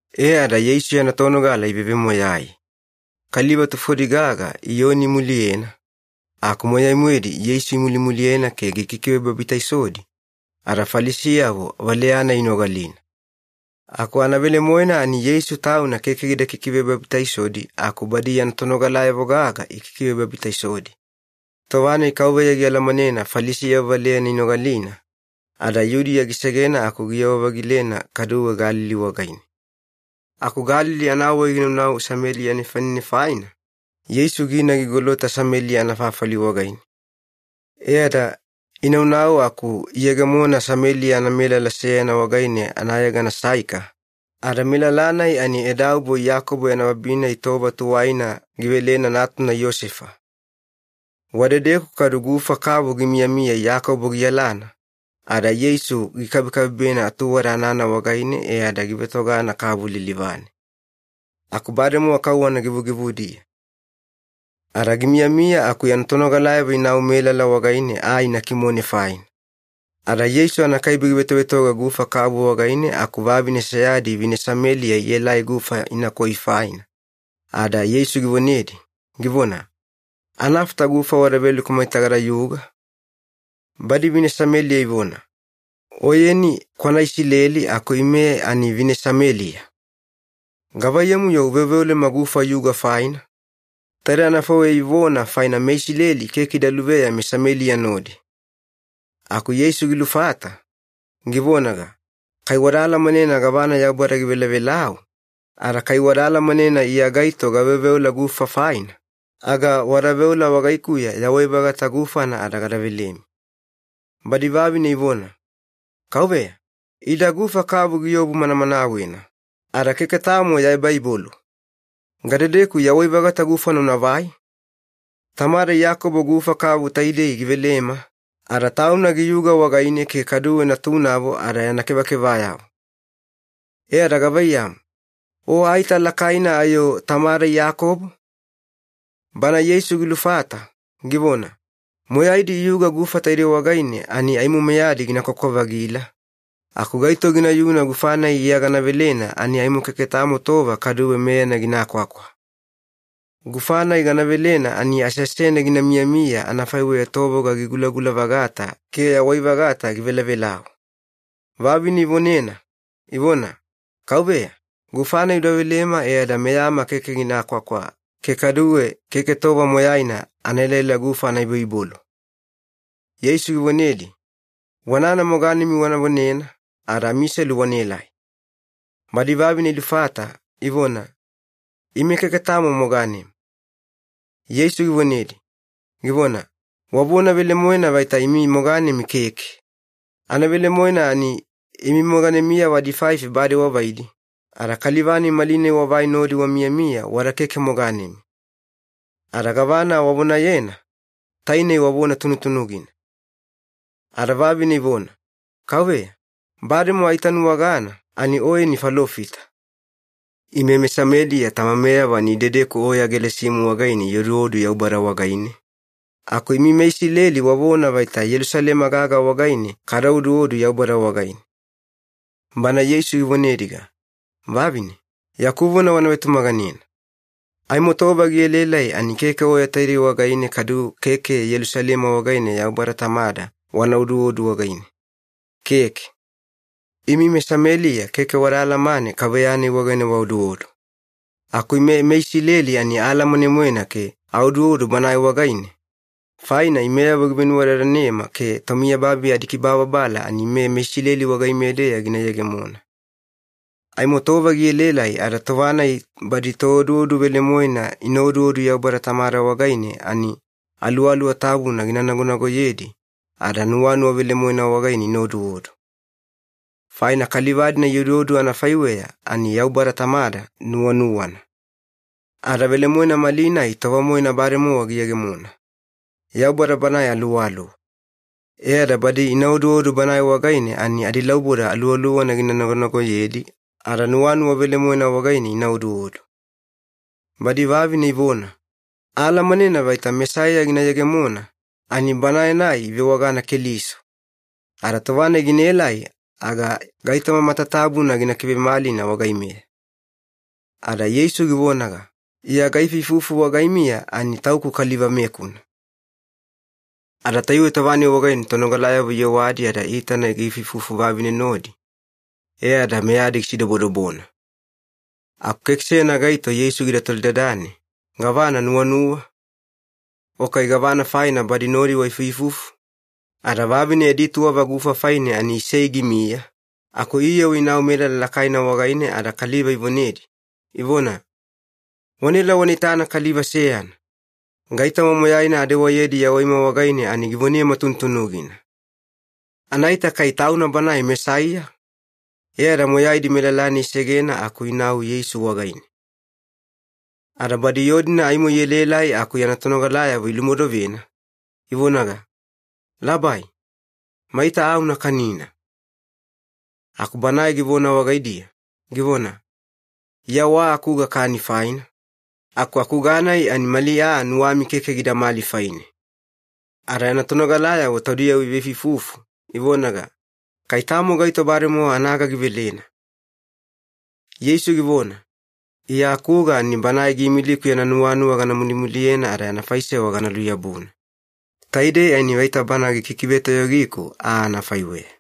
E ada Yeisu yana tonogala ivevemoyai. Kaliva tufodi gaga Iyoni imuliyena, aku moyai-moedi Yeisu imulimuliyena ke gikikivebabitaisodi, ada Falisiyavo valeya-nai inogalina. Aku anavelemoena ani Yeisu Tauna keke gida kikivebabitaisodi aku badi yana tonogalayavo gaga ikikivebabitaisodi. Tova-nai Kauveya gialamanena Falisiyavo valeyana inogalina, ada Yudiya gisegena aku giyewa-vagilena kaduwe Galili wagaine. Aku Galili anawai ginaunau Sameliya nefanine faina, Yeisu gina gigolota Sameliya anafafali wagaine. E ada inaunau aku iyegemona Sameliya anamelala seyana wagaine anayegana Saika, ada melala-nai ani edaubo Iyakobo yana babi-nai tova tuwaina givelena natuna Iyosefa. Wadedeku kadu gufa kavu gimiyamiya Iyakobo giyalana, ada Yeisu gikabekabebena atuwada anana wagaine e ada givetogana kavu lilivane. Aku bademowa kauwana givugivudiya. Ada gimiyamiya aku yana tonogalayavo inau melala wagaine aa ina kimone faina. Ada Yeisu anakaibe givetovetoga gufa kavu wagaine aku vavine seyadi vine Sameliya ielai gufa inakoi faina, ada Yeisu givonedi, givona, “Anafata gufa wada veleku maita gadayuga?” Badi vine Sameliya ivona, “Oyeni kwana Isileli aku ime ani vine Sameliya. Gavaiyamu-yo uveoveolema gufa yuga faina?” Taidei anafaiweya ivona faina meIsileli keke ida luveya meSameliya nodi. Aku Yeisu gilufata, givonaga, “Kai wada alamanena gavana Yaubada givelavelau, ada kai wada alamanena Iya gaito gaveoveola gufa faina, aga wada veola wagaikuya yawai-vagata gufana ada gada velemi.” Badi vavine ivona, “Kauveya, ida gufa kavu giobu manamanawena, ada keke tamo ya ebaibolu. Gadedeku yawai-vagata gufana unavai? Tamada Iyakobo gufa kavu taidei givelema, ada tauna giyuga wagaine ke kaduwe natunavo ada yana kevakevayavo. E ada gavaiyamu, o aita lakaina ayo tamada Iyakobo?” Bana Yeisu gilufata, givona, “Moyaidi iyuga gufa taidei wagaine ani aimo meyadi gina kwakwa-vagila, aku gaito ginayuna gufa-nai Iya gana velena ani aimo keke tamo tova kaduwe meyana gina kwakwa. Gufa-nai gana velena ani aseasene gina miyamiya anafaiweya tovoga gigulagula-vagata ke yawai-vagata givelavelau.” Vavine ivonena, ivona, “Kauveya, gufa-nai uda velema e ada meyama keke gina kwakwa ke kaduwe keke tova moyaina ana elaela gufa ana iboibolu.” Yeisu givonedi, “Wanana moganemi wana vonena ada amiselu wanaelai.” Badi vavine ilufata, ivona, “Ime keke tamo moganema.” Yeisu givonedi, givona, “Wavona velemoena vaita imi moganemi keke. Anavelemoena ani imi moganemiyavo adifaifi bade wavaidi, ada kaliva-nai malinai wavai nodi wamiyamiya wada keke moganemi. Ada gavana wavonayena, tainei wavona tunutunugina.” Ada vavine ivona, “Kauveya, bademowa aitanuwagana ani Oyeni falofita. Ime meSameliya tamameyavo ani idedeku oya Gelasimu wagaine ioduodu Yaubada wagaine, aku imi meIsileli wavona vaita Yelusalema gaga wagaine kada oduodu Yaubada wagaine.” Bana Yeisu givonediga, “Vavine, yaku vona wana vetumaganena. Aimo tova gielaelai ani keke oya taidei wagaine kadu keke Yelusalema wagaine Yaubada Tamada wana oduodu wagaine, keke. Imi meSameliya keke wada alamane Kauveya-nai wagaine waoduodu. Aku ime meIsileli ani aalamane-moena ke aoduodu Banae wagaine, faina imeyavo givenuwadadanema ke tomiyababi adikibababala ani ime meIsileli wagaimeya-deya gina yegemona. Aimo tova gielaelai ada tova-nai badi tooduodu velemoena ina oduodu Yaubada Tamada wagaine ani Aluwaluwa Tabuna gina nagonagoyedi ada nuwanuwa velemoena wagaine ina oduodu. Faina kaliva-dina ioduodu anafaiweya ani Yaubada Tamada nuwanuwana. Ada velemoena malinai tova-moena bademowa giyegemona. Yaubada Banae Aluwaluwa. E ada badi ina oduodu Banae wagaine ani adilauboda Aluwaluwana gina nagonagoyedi ada nuwanuwa velemoena wagaine ina oduodu.” Badi vavine ivona, “Aalamanena vaita Mesaiya gina yegemona, ani Banae-nai ivewagana Keliso. Ada tova-nai ginaelai aga gaitoma matatabuna gina kivemalina wagaimeya.” Ada Yeisu givonaga, “Iya gaifuifufu wagaimiya ani Tauku Kaliva-mekuna.” Ada tayuwe tova-nai wagaine tonogalayavo iyewadi ada iitana giifuifufu vavine nodi, e ada meyadi gisidobodobona. Aku keke seyana gaito Yeisu gida tolidadane, “Gavana nuwanuwa?” o kai “Gavana faina ada badi nodi waifuifufu?” Ada vavine yadi tuwava gufa faine ani isei gimiya, aku iyewa inau melala lakaina wagaine ada kaliva ivonedi, ivona, “Wanaela wana itana kaliva seyana! Gaitoma moyaina adewayedi yawaima wagaine ani givonema tunutunugina. Anaita kai Tauna Banae Mesaiya?” E ada moyaidi melala-nai isegena aku inau Yeisu wagaine. Ada badi yoo-dina aimo ielaelai aku yana tonogalayavo ilumodovena, ivonaga, “Labai, maita aa una kanina.” Aku Banae givona wagaidiya, givona, “Iya wa akuga kani faina, aku akuga-nai ani mali aa nuwami keke gidamali faine.” Ada yana tonogalayavo taudiyavo iveifuifufu, ivonaga, “Kai tamo gaito bademowa anaga givelena.” Yeisu givona, “Iya akuga ani Banae giimiliku yana nuwanuwa gana mulimuliyena ada yana faisewa gana luyabuna. Taidei ani vaita bana gikikivetoyogiku aa anafaiweya.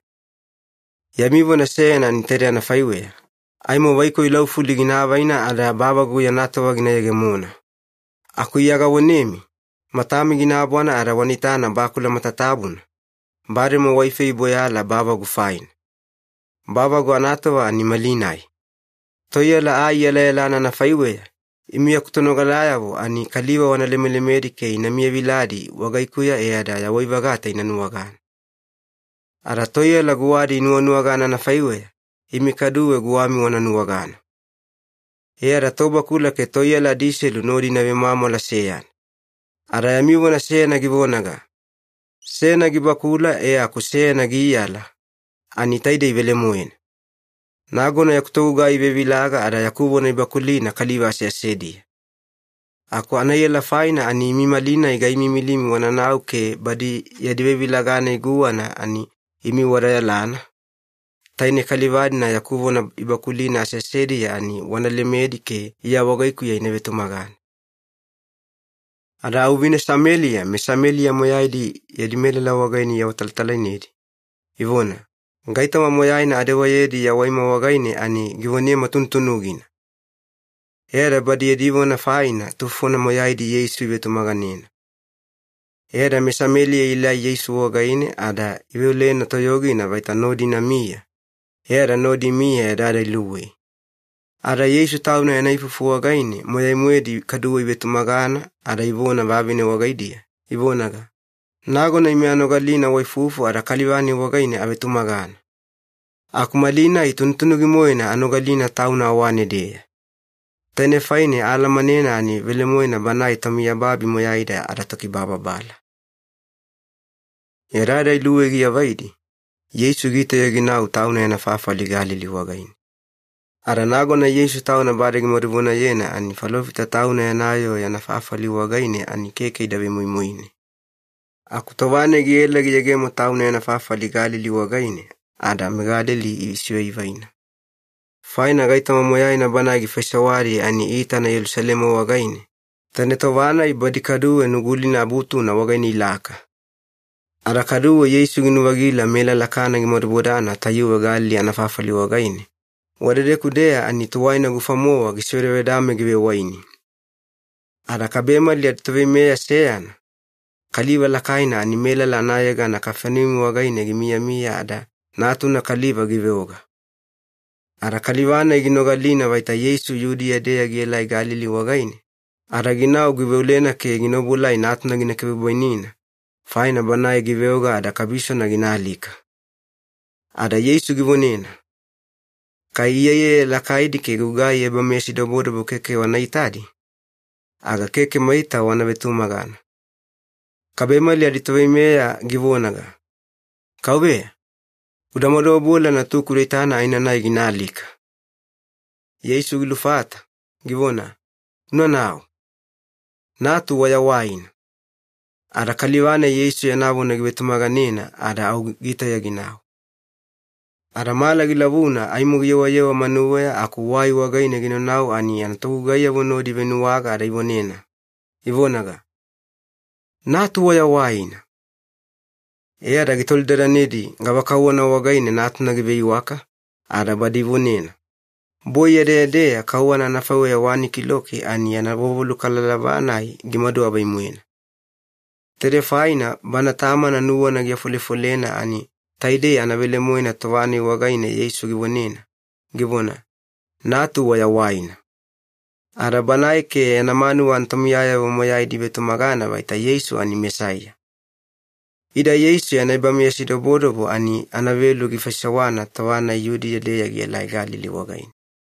Yami vona seyana ani taide anafaiweya, ‘Aimo vaikoi laufuli gina avaina ada bavagu anatova gina yegemona.’ Aku Iya gavonemi, matami gina abwana ada wana itana bakula matatabuna, bademowa waifei iboyala bavagu faina. Bavagu anatova ani malinai! Toiyala aa iyalayalana anafaiweya, imi yaku tonogalayavo ani kaliva wana lemelemedi ke ina miyaviladi wagaikuya e ada yawai-vagata ina nuwagana. Ada toiyala guwadi inuwanuwagana anafaiweya, imi kaduwe guwami wana nuwagana. E ada tobakula ke toiyala adiselu nodi ina vemwamwala seyana. Ada yami vona seyana givonaga, ‘Seyana gibakula e aku seyana giiyala’, ani taidei velemoena. Nagona yaku togugai ivevilaga ada yaku vona ibakulina kaliva aseasediya. Aku anaiyala faina ani imi malinai gaimiimilimi wananau ke badi yadi vevilaga-nai guwana ani imi wada yalana, tainei kaliva-dina yaku vona ibakulina aseasediya ani wana lemedi ke Iya wagaikuya ina vetumagana.” Ada au vine Sameliya meSameliya moyaidi yadi melala wagaine iawatalatalainedi, ivona, “Gaitoma moyaina adewayedi yawaima wagaine ani givonema tunutunugina!” E ada badi yadi vona faina tufona moyaidi Yeisu ivetumaganena. E ada meSameliya ielai Yeisu wagaine ada iveolena toyogina vaita nodi inamiya, e ada nodi imiya yadayada iluwei. Ada Yeisu Tauna yana ifufu wagaine moyai-moedi kaduwe ivetumagana ada ivona vavine wagaidiya, ivonaga, “Nagona ime anogalina waifufu ada kaliva-nai wagaine avetumagana. Aku malinai tunutunugi-moena anogalina Tauna awane-deya. Tainei faine aalamanena ani velemoena Banae tomiyababi moyaida adaTokibababala.” Yadayada iluwei giavaidi, Yeisu gitauya ginau Tauna yana fafali Galili wagaine. Ada nagona Yeisu Tauna bade gimaduvonayena ani falofita tauna yana yoo yana fafali wagaine ani keke ida vemoimoine. Aku tova-nai giela giyegemo Tauna yana fafali Galili wagaine ada meGalili isivaivaina. Faina gaitoma moyaina Banae gifaisewadi ani iitana Yelusalema wagaine, taine tova-nai badi kaduwe Nugulina Abutuna wagaine ilaka. Ada kaduwe Yeisu ginu-vagila melala Kana gimadubodana tayuwe Galili anafafali wagaine, wadedeku-deya ani tuwaina gufa-mowa gisevedavedame givewaini. Ada kabemali aditoveimeya seyana, kaliva lakaina ani melala anayegana Kafaneumi wagaine gimiyamiya ada natuna kaliva giveoga. Ada kaliva-nai ginogalina vaita Yeisu Yudiya-deya gielai Galili wagaine, ada ginau giveolena ke gina obuelai natuna gina kivebwainina, faina banae giveoga ada kabisona gina alika. Ada Yeisu givonena, “Kai iyaiyaya lakaidi ke gugai ebameyasidobodobo keke wana itadi, aga keke maita wana vetumagana.” Kabemali aditoveimeya givonaga, “Kauveya, uda maduobuela natuku uda itana aenanai gina alika.” Yeisu gilufata, givona, “Unanau. Natu wayawaina.” Ada kaliva-nai Yeisu yana vona givetumaganena ada au gitauya ginau. Ada mala gilavuna aimo giyewayewa manuweya aku wai wagaine ginaunau ani yana togugaiyavo nodi ivenuwaga ada ivonena, ivonaga, “Natu wayawaina!” E ada gitolidadanedi gavakauwana wagaine natuna giveiwaka, ada badi ivonena, “Boi yadeyadeya kauwana anafaiweya wani kiloki ani yana vovolukalalava-nai gimadu avai-moena.” Taidei faina bana tamana nuwana giafolefolena ani taidei anavelemoena tova-nai wagaine Yeisu givonena, givona, “Natu wayawaina.” Ada banae ke yana manuwa anatomiyayavo moyaidi ivetumagana vaita Yeisu ani Mesaiya. Ida Yeisu yana ebameyasidobodobo ani anavelu gifaisewana tova-nai Yudiya-deya gielai Galili wagaine.